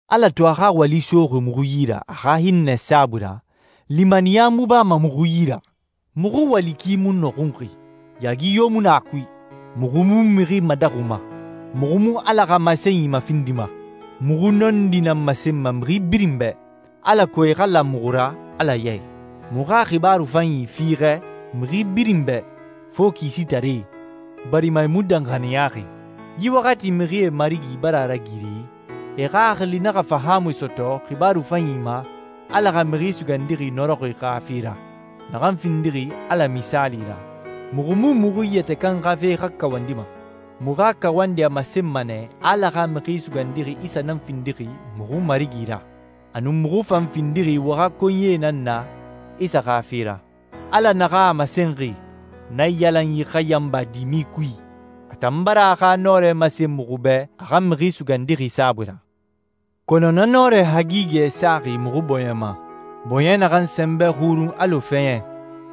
Ala to a xa wali soxi muxu yi ra a xa hinnɛ saabui ra, limaniya mu bama muxu yi ra. Muxu wali ki mu nɔxunxi, yaagi yo mu na a kui. Muxu mu mixi madaxuma, muxu mu Ala xa masenyi mafindima. Muxu nɔndi nan masenma mixi birin bɛ, alako e xa la muxu ra Ala ya i. Muxu xa xibaaru fanyi fiixɛ mixi birin bɛ, fo kisitaree, barima e mu danxaniyaxi. Yi waxati mixie marigi bara a ragiri e xaxili naxa fahaamui sɔtɔ xibaaru fanyi ma Ala xa Mixi Sugandixi nɔrɔxi xa fe ra, naxan findixi Ala misaali ra. Muxu mu muxu yɛtɛ kan xa fe xa kawandima. Muxu xa kawandi a masenma nɛ a Ala xa Mixi Sugandixi Isa nan findixi muxu Marigi ra, a nun muxu fan findixi wo xa konyie nan na Isa xa fe ra. Ala naxan a masenxi, «Naiyalanyi xa yanba dimi kui,» a tan bara a xa nɔrɛ masen muxu bɛ a xa Mixi Sugandixi saabui ra. Kɔnɔ na nɔrɛ hagigɛ saxi muxu bɔɲɛ ma, bɔɲɛ naxan sɛnbɛ xurun alɔ fɛɲɛ,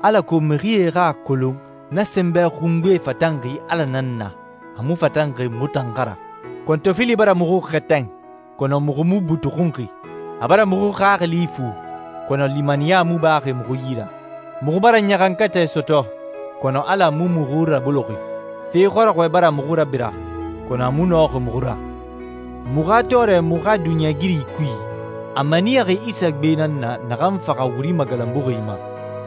alako mixie xa a kolon na sɛnbɛ xungbe fatanxi Ala nan na, a mu fatanxi muxu tan xa ra. Kɔntɔfili bara muxu xɛtɛn, kɔnɔ muxu mu butuxunxi. A bara muxu xaxili ifu, kɔnɔ limaniya mu baxi muxu yi ra. Muxu bara ɲaxankatɛ sɔtɔ, kɔnɔ Ala mu muxu raboloxi. Fe xɔrɔxɔɛ bara muxu rabira, kɔnɔ a mu nɔxi muxu ra. Muxu xa tɔɔrɛ muxu xa duniɲɛigiri kui, a maniyaxi Isa gbe nan na naxan faxa wuri magalanbuxi ma.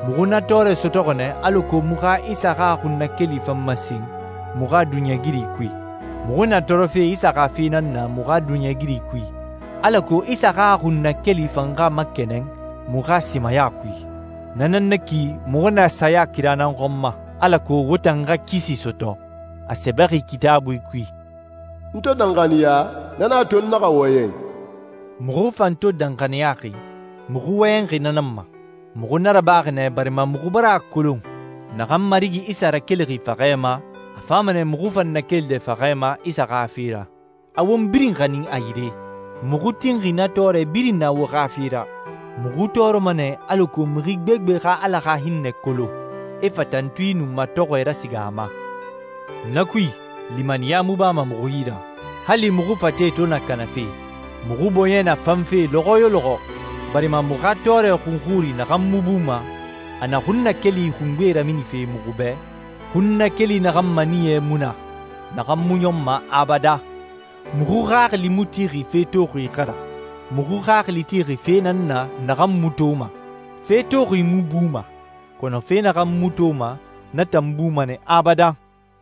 Muxu na tɔɔrɛ sɔtɔxi nɛ alako muxu xa Isa xa xunnakeli fan masen muxu xa duniɲɛigiri kui. Muxu na tɔɔrɔfe Isa xa fe nan na muxu xa duniɲɛigiri kui, alako Isa xa xunnakeli fan xa makɛnɛn muxu xa simaya kui. Na nan na ki muxu na saya kira nan xɔn ma, alako wo tan xa kisi sɔtɔ. A sɛbɛxi Kitaabui kui, «N to danxaniya, na nan a to n naxa wɔyɛn.» Muxu fan to danxaniyaxi, muxu wɔyɛnxi na nan ma. Muxu na rabaxi nɛ, barima muxu bara a kolon naxan Marigi Isa rakelixi faxɛ ma, a fama nɛ muxu fan nakelide faxɛ ma Isa xa fe ra, a won birin xanin a yire. Muxu tinxi na tɔɔrɛ birin na wo xa fe ra. Muxu tɔɔrɔma nɛ alako mixi gbegbe xa Ala xa hinnɛ kolon, e fa tantui nun matɔxɔɛ rasiga a ma. Na kui, limaniya mu bama muxu yi ra. Hali muxu fate to na kanafe, muxu bɔɲɛ na fanfe lɔxɔ yo lɔxɔ, barima muxu xa tɔɔrɛ xunxuri naxan mu buma, a na xunnakeli xungbe raminife muxu bɛ, xunnakeli naxan maniyɛ mu na, naxan mu ɲɔnma abadan. Muxu xaxili mu tixi fe toxi xa ra. Muxu xaxili tixi fe nan na naxan mu toma. Fe toxi mu buma, kɔnɔ fe naxan mu toma na tan buma nɛ abadan.